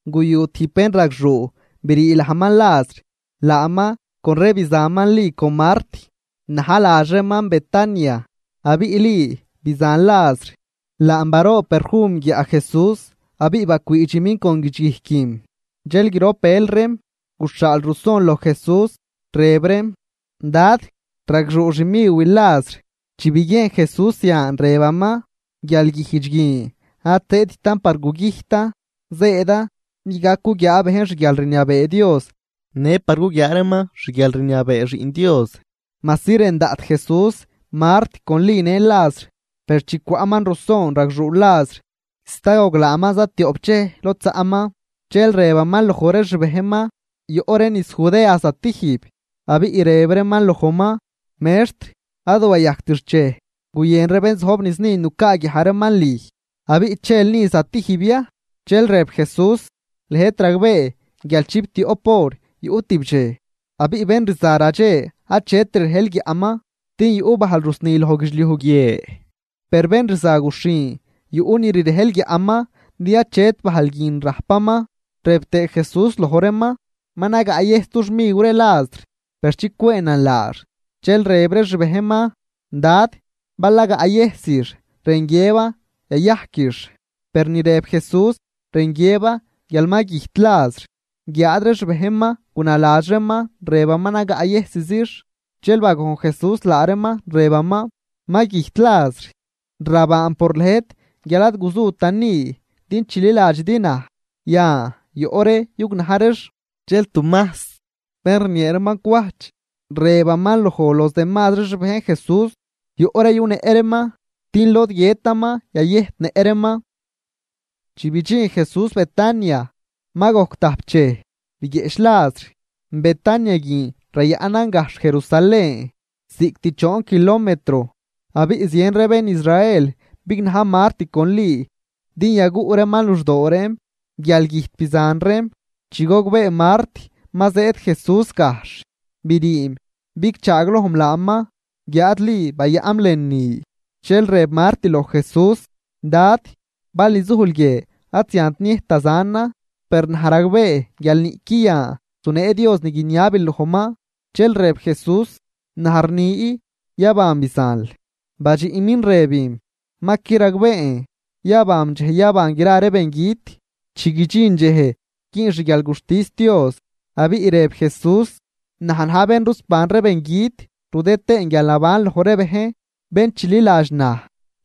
Guyu tijb bénragxuu, brii lajman Lazr. Laaman con re bizanman Li con Mart, na̱j ladx reeman Betania. Abiꞌ Li bizan Lazr, laam baroob perfum guiaꞌ Jesús abiꞌ bacwiidximin con guidxguijquim. Dxel grop bël reem guxhaal ruson loj Jesús, rëb reem: ―Dad, ragxuu xmiwil Lazr. Chi biguiejn Jesús zian, rëbaman: ―Guialguijdx guin ad zëëdtan par gugüjtan, zëëdan din gac guguiaa bejn xguialrniabee Dios në par guguiaa reeman xguialrniabee Xiꞌn Dios. Majsi rën daꞌt Jesús Mart con Li në Lazr, per chi cwaꞌman ruson ragxuu Lazr, sta goglaaman zatioꞌp dxej lod zaꞌman. Dxel rëbaman loj ree xbejnman: ―Yoꞌ ree niz Judea zatijb. Abiꞌ rëb reeman lojman: ―Mextr, ad wayajct xchej guyën ree bén zojb niz ni nucaaguiaj reeman lüj. ¿Abiꞌ chel ni zatijb ya? Dxel rëb Jesús: ―Lëjt ragbee guial chiptioꞌp hor yuꞌ tibdxej. Abiꞌ bén rza radxe, achet rirejl guiaꞌman, din yuꞌ bajl rusni loj guidxliuj guie. Per bén rza guxhin, yuꞌ ni rirejl guiaꞌman, din achet bajl guin rajpaman. Rëb tëë Jesús loj reeman: ―Ma nagaꞌyëjs dux miw ree Lazr, per chicwëënan laax. Dxel rëb ree xbejnman: ―Dad, bal naayëjsix, rën guiëban yayajquix. Per ni rëb Jesús rën guiëban guial ma güjt Lazr, guiáad ree xbejnman gunaladx reeman rëbaman nagaꞌyëjsizix. Dxel bagojn Jesús laa reeman, rëbaman: ―Ma güjt Lazr. Rabaan por lëjt guial ad guzutan ni din chililadxidi naj. Yan, yoꞌ ree yugnaj reex. Dxel Tumajs, bén rniee reeman cwajch, rëbaman loj los demazri xbejn Jesús: ―Yoꞌ ree yunëꞌ reeman, din lod guiëtaman, yayëjtnëꞌ reeman. Chi bidxin Jesús Betania, ma gojc tajp dxej biguieꞌch Lazr. Betania guin rayaꞌnan gajxh Jerusalén, ziꞌct choon kilometro. Abiꞌ zien ree bén Israel bignaj Mart con Li din yaguꞌ reeman luxdoo reem guial güjt bizan reem. Chi gogbee Mart ma zëëd Jesús gajxh, briim bigchaaglojm laaman, guiáad Li bayaꞌnm lënü. Dxel rëb Mart loj Jesús: ―Dad, bal nizujl guie, ad ziant niëjt da zanan. Per naj ragbee guial niꞌqui yan zunee Dios ni guiniabil lojman. Dxel rëb Jesús: ―Naj rni yaban bizanl. Badxiꞌmin rëbim: ―Ma qui ragbeen, yabanm dxej yaban gra ree bengüt. Chi guidxin dxej güün xguialguxtis Dios. Abiꞌ rëb Jesús: ―Naj na̱j bén rusban ree bengüt rudë tëën guialnaban loj ree bejn. Bén chililadx naj,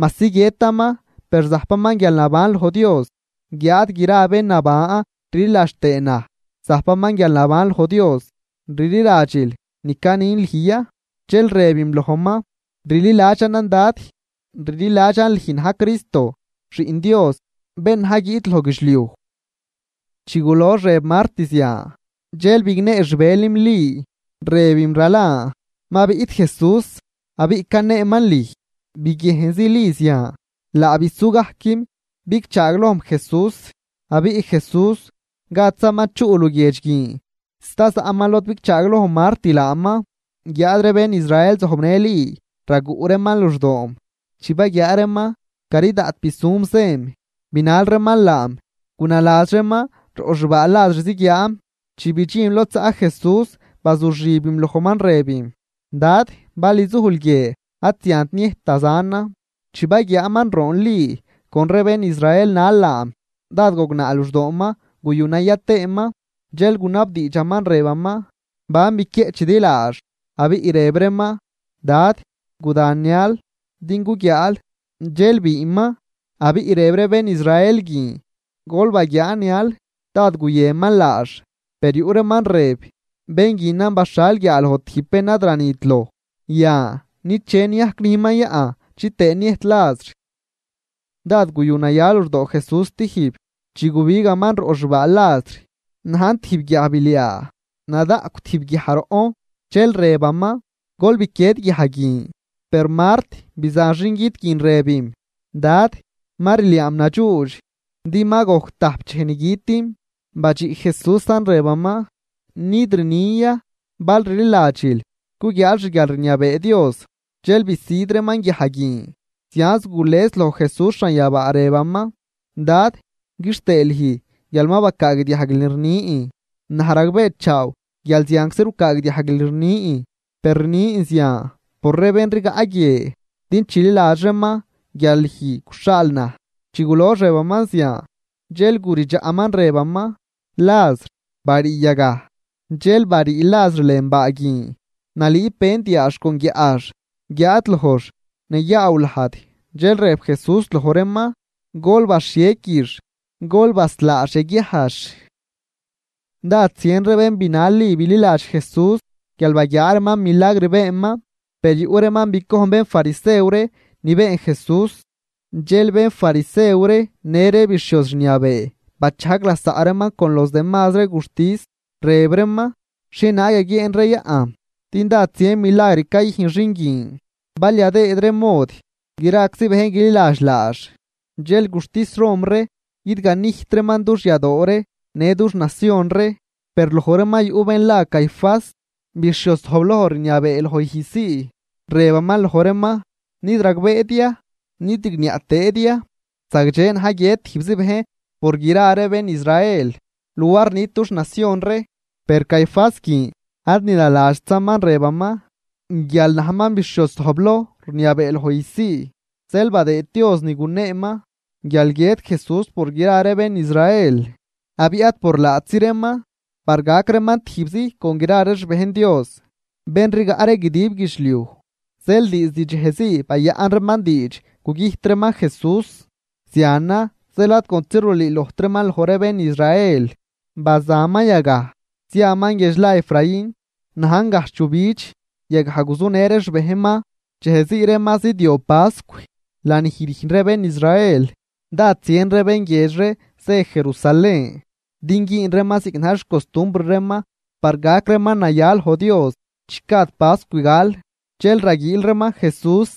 majsi guiëtaman, per zajpaman guialnaban loj Dios. Guiáad gra bén naban rliladx tëë naj, zajpaman guialnaban loj Dios. ¿Rliladxil ni canin lüj ya? Dxel rëbim lojman: ―Rliladxanan Dad. Rliladxan lüj na̱j Cristo, Xiꞌn Dios, bén na̱j guiꞌt loj guidxliuj. Chi gulox rëb Mart zian, dxel bignee xbëlim Li, rëbim ralan: ―Ma biꞌt Jesús, abiꞌ caneeman lüj. Biguiejnzi Li zian, laa bisugajquim bigchaaglojm Jesús. Abiꞌ Jesús gadzaman chuꞌ luguiedx guin, sta zaꞌman lod bigchaagloj Mart laaman. Guiáad ree bén Israel zojbnë Li raguꞌ reeman luxdoom, chi baguiaa reeman cari daꞌt bisum zëm, binal reeman laam. Gunaladx reeman roꞌ xbaa Lazr ziguiaanm. Chi bidxinm lod zaꞌ Jesús, bazuxibim lojman rëbim: ―Dad, bal nizujl guie, ad ziant niëjt da zanan. Chi baguiaaman roon Li con ree bén Israel nal laam, dád gognaa luxdooman guyu naya tëëman. Dxel gunabdiidxaman rëbaman: ―¿Ban biquieꞌchidi laax? Abiꞌ rëb reeman: ―Dad, guda nial din guguiaal. Dxel biinman. Abiꞌ rëb ree bén Israel guin: ―Gol baguiaa nial dád guyënman laax. Per yuꞌ reeman rëb: ―Bén guinan baxhal guiaaloj tijb bén ad ranit loj. Yan, ¿niche niajc nüjnman yaꞌn chitëë niëjt Lazr? Dád guyu naya luxdoo Jesús stijb, chi gubigaman roꞌ xbaa Lazr. Najn tijb guiajbiliaa, nadaꞌcw tijb guiaj roꞌn. Dxel rëbaman: ―Gol biquied guiaj guin. Per Mart, bizan xingüt guin, rëbim: ―Dad, ma rliaam nadxuudx, din ma gojc tajp dxej ni gütim. Badxiꞌ Jesúsan rëbaman: ―¿Nid rnin ya, bal rliladxil, guguiaal xguialrniabee Dios? Dxel bisüd reeman guiaj guin. Zianz gules loj Jesús xanyabaa rëbaman: ―Dad, quixtëë lüj guial ma bacaagdiajguil ni rnin. Naj ragbeechaaw guial zianczi rucaagdiajguil ni rnin. Per rnin zian por ree bén rigaꞌ guie, din chililadx reeman guial lüj guxhaal naj. Chi gulox rëbaman zian, dxel guridxaꞌman rëbaman: ―¡Lazr, barii yagaj! Dxel barii Lazr lën baa guin nalüüb vend yaax con guiaꞌx, guiáad lojx nayaaw lajd. Dxel rëb Jesús loj reeman: ―Gol baxhiequix, gol baslaax yaguiajx. Dád zien ree bén binal Li bililadx Jesús, guial baguiaa reeman milagr beenman. Per yuꞌ reeman bicojn bénfarisew ree ni been Jesús. Dxel bénfarisew ree në ree bixhioz rniabee, bachajg lasaꞌ reeman con los demazri ree guxtis, rëb reeman: ―¿Xhienaag yaguieen ree yaꞌn, din dád zien milagr cayüjn xin guin? Bal yadëëd ree mod, graczi bejn guililadx laax, dxel guxtis Rom ree guidganijt reeman dux yadoo ree në dux nacion ree. Per loj reeman yuꞌ bén la Caifás, bixhioz zojbloj rniabee loj ijzsii, rëbaman loj reeman: ―¿Nid ragbeedi ya, nid rigniaꞌ tëëdi ya, zagdxe na̱j guiët tijbzi bejn por gra bén Israel, luar nit dux nacion ree? Per Caifás guin ad ni naladxtzaman rëbaman. Guial najman bixhioz zojbloj rniabee loj ijzsii, zeel badëëd Dios ni guneeman, guial guiët Jesús por gra ree bén Israel. Abiꞌ ad por laatzi reeman, par gac reeman tijbzi con gra ree xbejn Dios, bén rigaꞌ ree guidib guidxliuj. Zeel diizd dxejzii bayaꞌn reeman diidx gugüjt reeman Jesús. Zianan zeel ad contzi rulüülojtraman loj ree bén Israel, bazaman yagaj ziaman guiedx la Efraín, najn gajxh yujbidx, yagaj guzunë ree xbejnman. Dxejzii ree ma zidyob pascw, lanij rüjn ree bén Israel, dád zien ree bén guiedx ree zë Jerusalén din güün reeman ziꞌc na̱j xcostumbr reeman par gac reeman naya loj Dios chi gad pascw gal. Dxel raguiil reeman Jesús,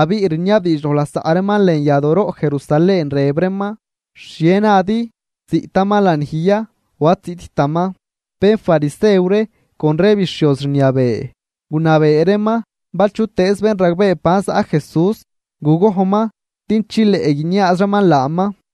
abiꞌ rniabdiidx loj lasaꞌ reeman lën yadooroꞌ Jerusalén, rëb reeman: ―¿Xhie nadi? ¿Ziꞌtaman lanij ya o ad ziꞌttaman? Bénfarisew ree con ree bixhioz rniabee, gunabee reeman bal chutëëz bén ragbee ban zaꞌ Jesús, gugojnman din chileꞌ guiniaaz reeman laaman.